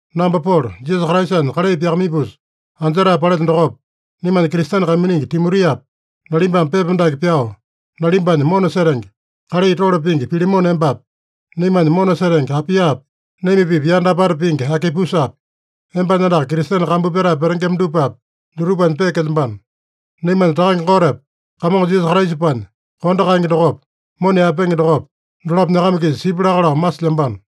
Namba Polo, Jisasa Kraisanya kalai pyakamaipusa anjetae palelyo dokopa, naimanya Kristene kaiminingi Timotiapa, nalimbame pepa dake pyao, nalimbanya mona setenge, kalai tole pingi Pilemone embapi, naimanya mona setenge Apiapi, naima-pipa yanda apata pingi Akipusapi, embanya andaka Kristene kambu pyatae petengema dupapi, dutupanya peekelyambano. Naimanya Takange Gotepa Kamongo Jisasa Kraisapanya kondo kaenge dokopa, mona yaepenge dokopa, dolapo nyakama-kisa sipya laka lao masilyambano.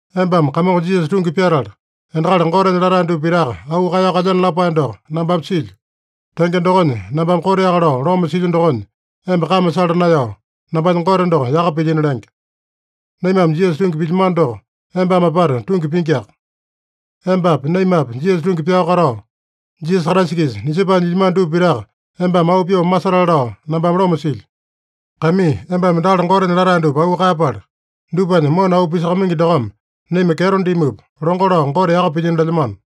Embame Kamongo Jisasa tungi pyatala, endakali Gotenya latae dupa pitaka auu kaeyao kalyeno lapae doko nambame silyo. Tenge dokonya, nambame koteaka lao loma silyo dokonya, emba kame sala naeyao, nambanya Gote doko yaka pilyino lenge. Naimame Jisasa tungi pilyamano doko embame apata tungi pingiaka. Embapi naimapi Jisasa tungi pyao katao, Jisasa Kraisa-kisa nisepae nyilyamano dupa pitaka embame auu pyoo masetale lao nambame loma silyo. Kaimii, embame endakali Gotenya latae dupa auu kaeyapala, dupanya mona auu pisakamaingi dokome naima kyeto dimupa, longo lao Gote yaka pilyino lelyamano.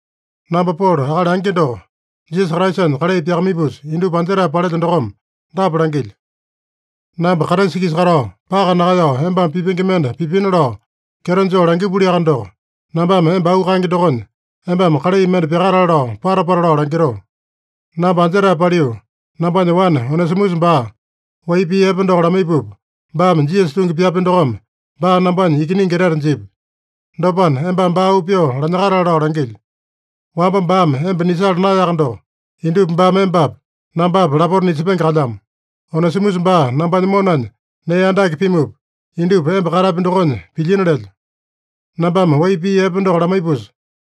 Namba Polo, akali angi doko, Jisasa Kraisanya kalai pyakamaipusa indupa anjetae palelyo dokome dapa langilyo: Namba Kraisa-kisa katao, paka nakaeyao embame pipenge mende pipina lao kyeto joo langipuliaka doko, nambame emba auu kaenge dokonya, embame kalai mende pyakatale lao pata-pata lao langitoo. Namba anjetae paliu, nambanya wane Onesimusa baa wai pii epe doko lamaipupa, baame Jisasa tungi pyapya dokome, baa nambanya ikiningi etete jipya. Dopana, embame baa auu pyoo lanyakatale lao langilyo. Wamba baame emba nisala naeyaka doko, indupa baame embapa, nambapa lapota nisepenge kalyamo. Onesimusa baa nambanya monanya nee andake pimupa, indupa emba katapi dokonya pilyina lelyo. Nambame wai pii epe doko lamaipusa,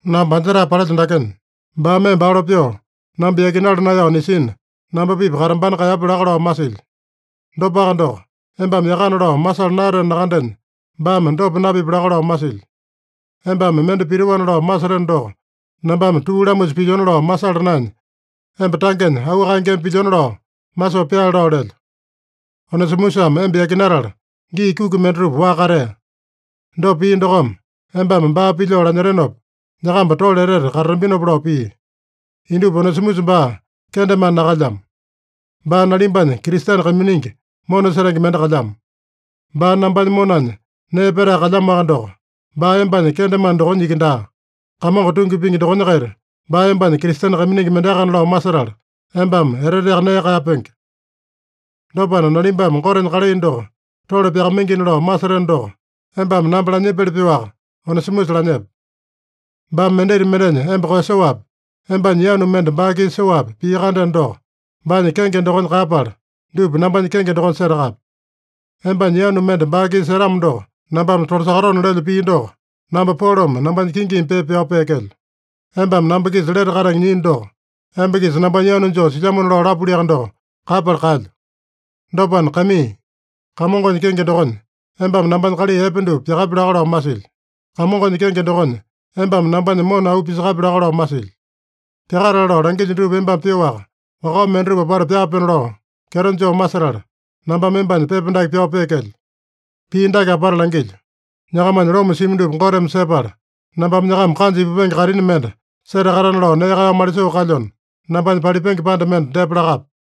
namba anjetae palelyo dakenya, baame emba alo pyoo namba yakinala naeyao nisina, namba-pipa katambana kaeyapya laka lao masilyo. Dopaka doko, embame yakana lao masala naeyateno nakandenya, baame dopa napipya laka lao masilyo. Embame mende pitoana lao maseteno doko, nambame tuu lamusa pilyona lao masala naenya, emba tangenya auu kaengeme pilyona lao masoo pyaale lao lelyo. Onesimusame emba yakinatala, gii kuki mendatupa waka katea. Dopa pia dokome, embame baa pilyoo lanyetenopa, nyakamba tole etete katatambinopa lao pia. Indupa Onesimusa baa kendemane nakalyamo. Baa nalimbanya Kristene kaiminingi mona setenge mende kalyamo. Baa nambanya monanya nee petae kalyamoaka doko, baa embanya kendemane dokonya iki daa, Kamongo tungi pingi dokonya-kaita, baa embanya Kristene kaiminingi mendeakana lao masetala, embame eteteaka nee kaeyapenge. Dopana, nalimbame Gotenya kalai doko tole pyakamaingina lao maseteno doko, embame namba lanyipili pyoaka Onesimusa lanyepe. Baame mendita mendenya emba koeyasoapi, embanya yanu mende baa-kisa soapi pia-kandeno doko, baanya kenge dokonya kaeyapala, dupa nambanya kenge dokonya setakape. Embanya yanu mende baa-kisa setamo doko, nambame tolasakatona lelyo pii doko namba Polome nambanya kingimi pepa pyao peekelyo. (Embame namba-kisa lete katenge nyiino doko, emba-kisa nambanya yanu joo silyamona lao lapuliaka doko, kaeyapala kaelyo.) Dopana, kaimii, Kamongonya kenge dokonya embame nambanya kalai epe dupa pyakapi laka lao masilyo. Kamongonya kenge dokonya embame nambanya mona auu pisakapi laka lao masilyo. Pyakatale lao langilyo dupa embame pyoaka, wakao mendatupa apata pyaapenona lao kyeto joo masetala, nambame embanya pepa dake pyao peekelyo. Pii dake apata langilyo: Nyakamanya loma simi dupa Goteme sepala, nambame nyakama kanja ipupenge kaitini mende setakatana lao nee kaeyao malisoo kalyona, nambanya palipenge panda mende depa lakape.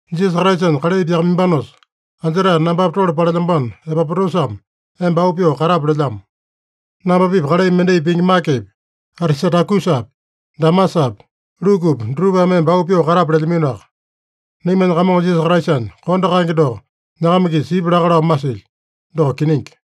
Jisasa Kraisanya kalai pyakamaimbanosa anjetae nambapa tole palelyambano Epapotasame emba auu pyoo katape lelyamo. Namba-pipa kalai mendai pingi Makepi, Atisatakusapi, Demasapi, Lukupi dutupame emba auu pyoo katape lelyaminoaka. Naimanya Kamongo Jisasa Kraisanya kondo kaenge doko nyakama-kisa sipya laka lao masilyo. Doko kiningi.